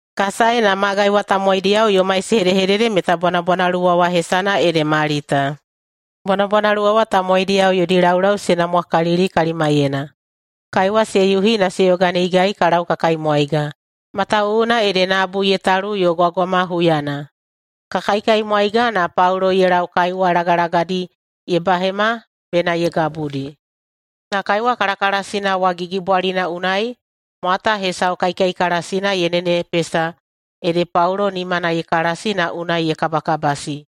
Ka sae, na magai wa tamowaidiyao yomai se hedehedede meta bwanabwanaluwa wa hesana ede Malita. Bwanabwanaluwa wa tamowaidiyao yodi laulau se namwakalili kalimaiyena. Kaiwa se yuhi na se yoganeigai ka lau ka kaimwaiga, matawuwuna ede nabu ye talu yo gwagwama huyana. Ka kaikaimwaiga, na Paulo ye lau kaiwa lagalagadi ye bahema bena ye gabudi. Na kaiwa kalakalasina wa gigibwalina unai mwata hesau kaikaikalasina ye nenepesa ede Paulo nimana ye kalasi na unai ye kabakabasi.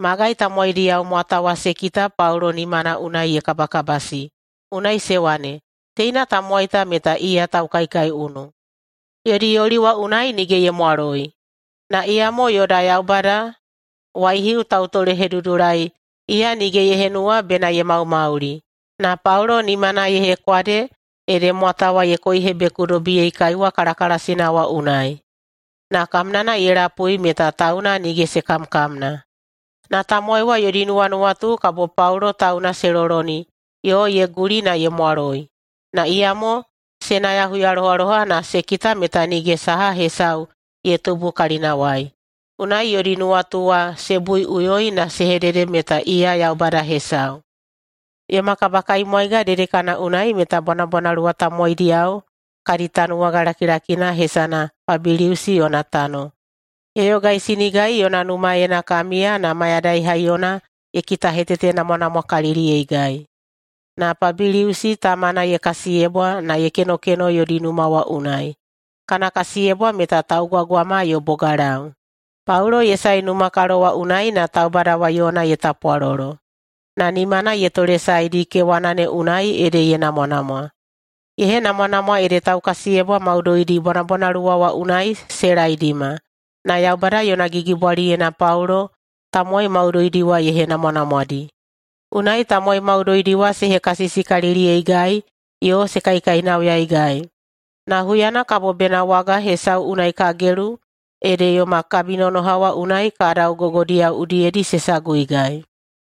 Magai tamowaidiyao mwata wa se kita Paulo nimana unai ye kabakabasi, unai se wane, “Teina tamowai ta meta iya taukaikaiunu! Yodi yoli wa unai nige ye mwaloi, na iyamo yoda yaubada waihiu Tautolehedudulai, iya nige ye henuwa bena ye maumauli.” Na Paulo nimana ye hekwade ede mwata wa ye koihebekudobiyei kaiwa kalakalasina wa unai, na kamnana ye lapui meta tauna nige se kamkamna. Na tamowai wa yodi nuwanuwatu kabo Paulo tauna se loloni yo ye guli na ye mwaloi, na iyamo se naya huyalohaloha na se kita meta nige saha hesau ye tubu kalinawai. Unai yodi nuwatu wa se buiꞌuyoi na se hedede meta iya yaubada hesau. Yoma kabakaimwaiga dedekana unai meta bwanabwanaluwa tamowaidiyao kadi tanuwaga lakilakina hesana Pabiliusi yona tano. Ye yogaisinigai yona numaena ka miya na mayadai haiyona ye kitahetetenamwanamwakaliliyeigai. Na Pabiliusi tamana ye kasiyebwa na ye kenokeno yodi numa wa unai. Kana kasiyebwa meta taugwagwama yo bogalau. Paulo ye sae numakalo wa unai na taubada wa yona ye tapwalolo, na nimana ye tolesaedi kewana ne unai ede ye namwanamwa. Ye henamwanamwa ede taukasiyebwa maudoidi bwanabwanaluwa wa unai se laedima, na Yaubada yona gigibwaliyena Paulo tamowai maudoidi wa ye henamwanamwadi. Unai tamowai maudoidi wa se hekasisikaliliyeigai yo se kaikainauyaigai. Na huyana kabo bena waga hesau unai ka gelu, ede yoma kabinonoha wa unai kadau gogodiyao udiyedi se saguigai.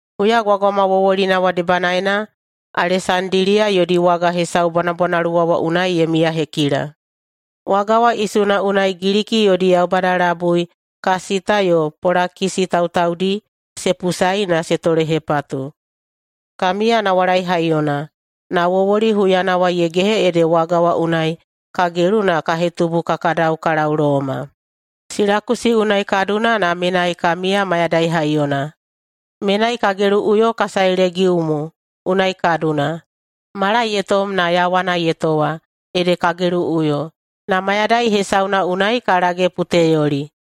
Huyagwagwama wowolina wa debanaena Alesandiliya yodi waga hesau bwanabwanaluwa wa unai ye miyahekila. Waga wa isuna unai Giliki yodi yaubada labui Kasita yo Polakisi tautaudi se pusaei na se tolehepatu. Ka miya nawalai haiyona, na wowoli huyana wa ye gehe ede waga wa unai ka gelu na ka hetubu ka kadau ka lau Loma. Silakusi unai ka duna na menai ka miya mayadai haiyona. Menai ka geluꞌuyo ka sae Legiumu unai ka duna. Mala ye tom na yawana ye towa, ede ka geluꞌuyo, na mayadai hesauna unai ka lage Puteyoli.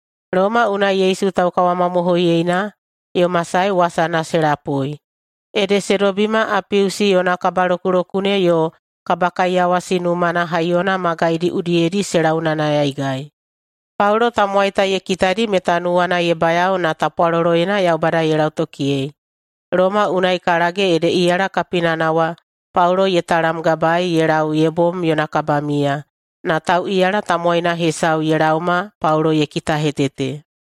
Loma unai Yesu taukawamamohoiyena yoma sae wasana se lapui, ede se dobima Apiusi Yona Kabalokulokune yo Kabakaiyawasi Numana Haiyona magaidi udiyedi se launayanayaigai. Paulo tamowai ta ye kitadi meta nuwana ye bayao na tapwaloloyena Yaubada ye lautokiyei. Loma unai ka lage ede iyala kapinana wa Paulo ye talamgabaei ye lau ye bom yona kabamiya, na tauꞌiyala tamowaina hesau ye laoma Paulo ye kitahetete.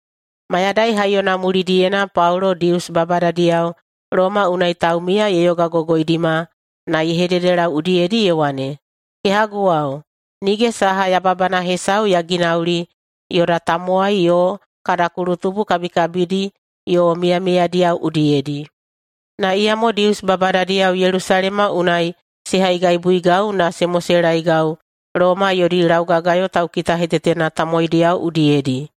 Mayadai haiyona mulidiyena Paulo Dius babadadiyao Loma unai taumiya ye yogagogoidima na ye hededelau udiyedi ye wane, “Kehaguwao, nige saha yababana hesau ya ginauli yoda tamowai yo kada kulutubu kabikabidi yo miyamiyadiyao udiyedi, na iyamo Dius babadadiyao Yelusalema unai se haigaibuigau na se moselaegau Loma yodi laugagayo taukitahetetena tamowaidiyao udiyedi.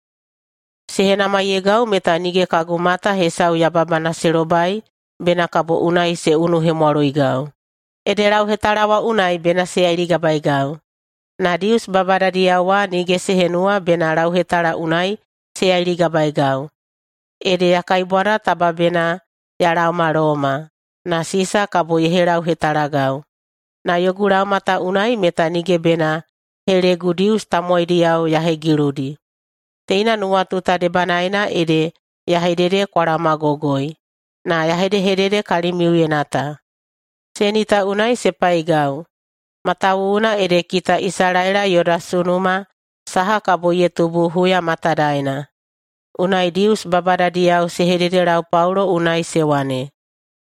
Se henamaiyeigau meta nige kagu mata hesau yababana se lobai bena kabo unai se unuhemwaloigau, ede lauhetala wa unai bena se yailigabaeigau. Na Dius babadadiyao wa nige se henuwa bena lauhetala unai se yailigabaeigau. Ede ya kaibwada taba bena ya laoma Loma, na Sisa kabo ye helauhetalagau. Na yogu laoma ta unai meta nige bena helegu Dius tamowaidiyao ya hegiludi. Teina nuwatu ta debanaena ede ya hedede kwa laomagogoi, na ya hedehedede kalimiuyena ta. Seni ta unai se paigau, matawuwuna ede kita Isalaela yoda sunuma saha kabo ye tubu huya matadaena.” Unai Dius babadadiyao se hededelau Paulo unai se wane,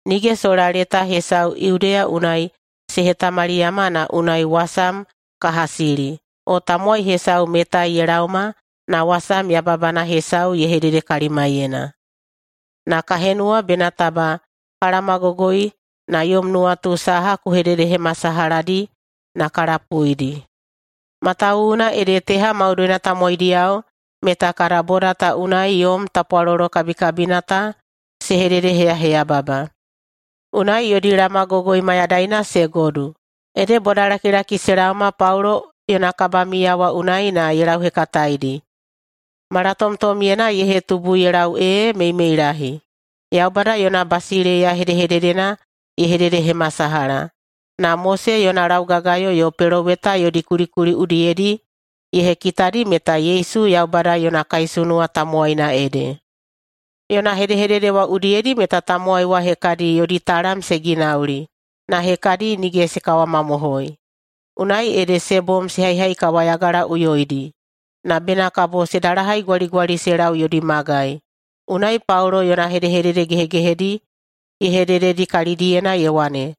“Nige sola leta hesau Yudeya unai se hetamaliyama na unai wasam ka hasili, o tamowai hesau metai ye laoma na wasam yababana hesau ye hedede kalimaiyena. Na ka henuwa bena taba ka laomagogoi na yom nuwatu saha ku hededehemasalahadi na ka lapuidi, matawuwuna ede teha maudoina tamowaidiyao meta kada boda ta unai yom tapwalolo kabikabina ta se hededeheyaheyababa.” Unai yodi laomagogoi mayadaina se godu, ede bodalakilaki se laoma Paulo yona kabamiya wa unai na ye lauhekataeidi, malatomtomyena ye hetubu ye lau ee meimeilahi. Yaubada yona basileiya hedehededena ye hededehemasalaha, na Mose yona laugagayo yo peloweta yodi kulikuli udiyedi ye hekitadi meta Yesu Yaubada yona kaisunuwa tamowaina ede. Yona hedehedede wa udiyedi meta tamowai wa hekadi yodi talam se ginauli, na hekadi nige se kawamamohoi. Unai ede se bom se haihaikawayagalaꞌuyoidi. Na bena kabo se dalahaigwaligwali se lau yodi magai, unai Paulo yona hedehedede gehegehedi ye hedededi kalidiyena ye wane,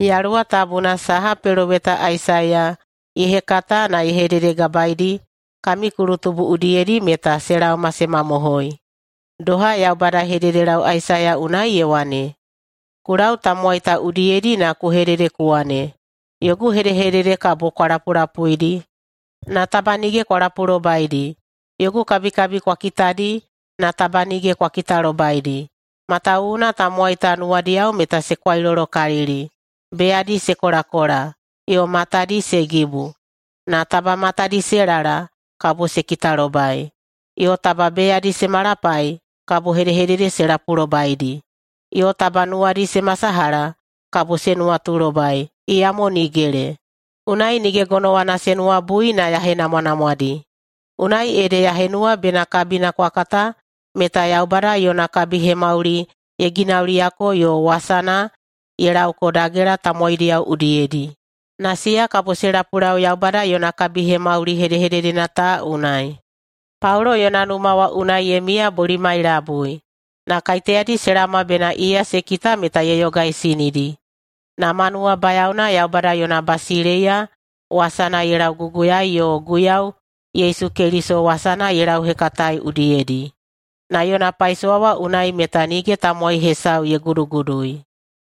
“Yaluwa Tabuna saha peloweta Aisaiya ye hekata na ye hededegabaeidi kami kulutubu udiyedi meta se laoma se mamohoi. Doha Yaubada ye hededelau Aisaiya unai ye wane, ‘Ku lau tamowai ta udiyedi na ku hedede ku wane, “Yogu hedehedede kabo kwa lapulapuidi, na taba nige kwa lapulobaidi. Yogu kabikabi kwa kitadi, na taba nige kwa kitalobaidi.” Matawuwuna tamowai ta nuwadiyao meta se kwailolokalili, beyadi se kolakola, yo matadi se gibu. Na taba matadi se lala, kabo se kitalobai, yo taba beyadi se malapai, kabo hedehedede se lapulobaidi, yo taba nuwadi se masalaha, kabo se nuwatulobai, iyamo nigele. Unai nige gonowana se nuwabui na ya henamwanamwadi.’ Unai ede ya henuwa bena kabina kwa kata meta Yaubada yona kabihemauli ye ginauliyako yo wasana ye laoko dagela tamowaidiyao udiyedi. Na siya kabo se lapulau Yaubada yona kabihemauli hedehededena ta unai.” Paulo yona numa wa unai ye miya bolimai labui. Na kaiteyadi se laoma bena iya se kita meta ye yogaisinidi, na ma nuwabayaona Yaubada yona basileiya wasana ye lauguguyaei yo Guiyau Yesu Keliso wasana ye lauhekataei udiyedi. Na yona paisowa wa unai meta nige tamowai hesau ye gudugudui.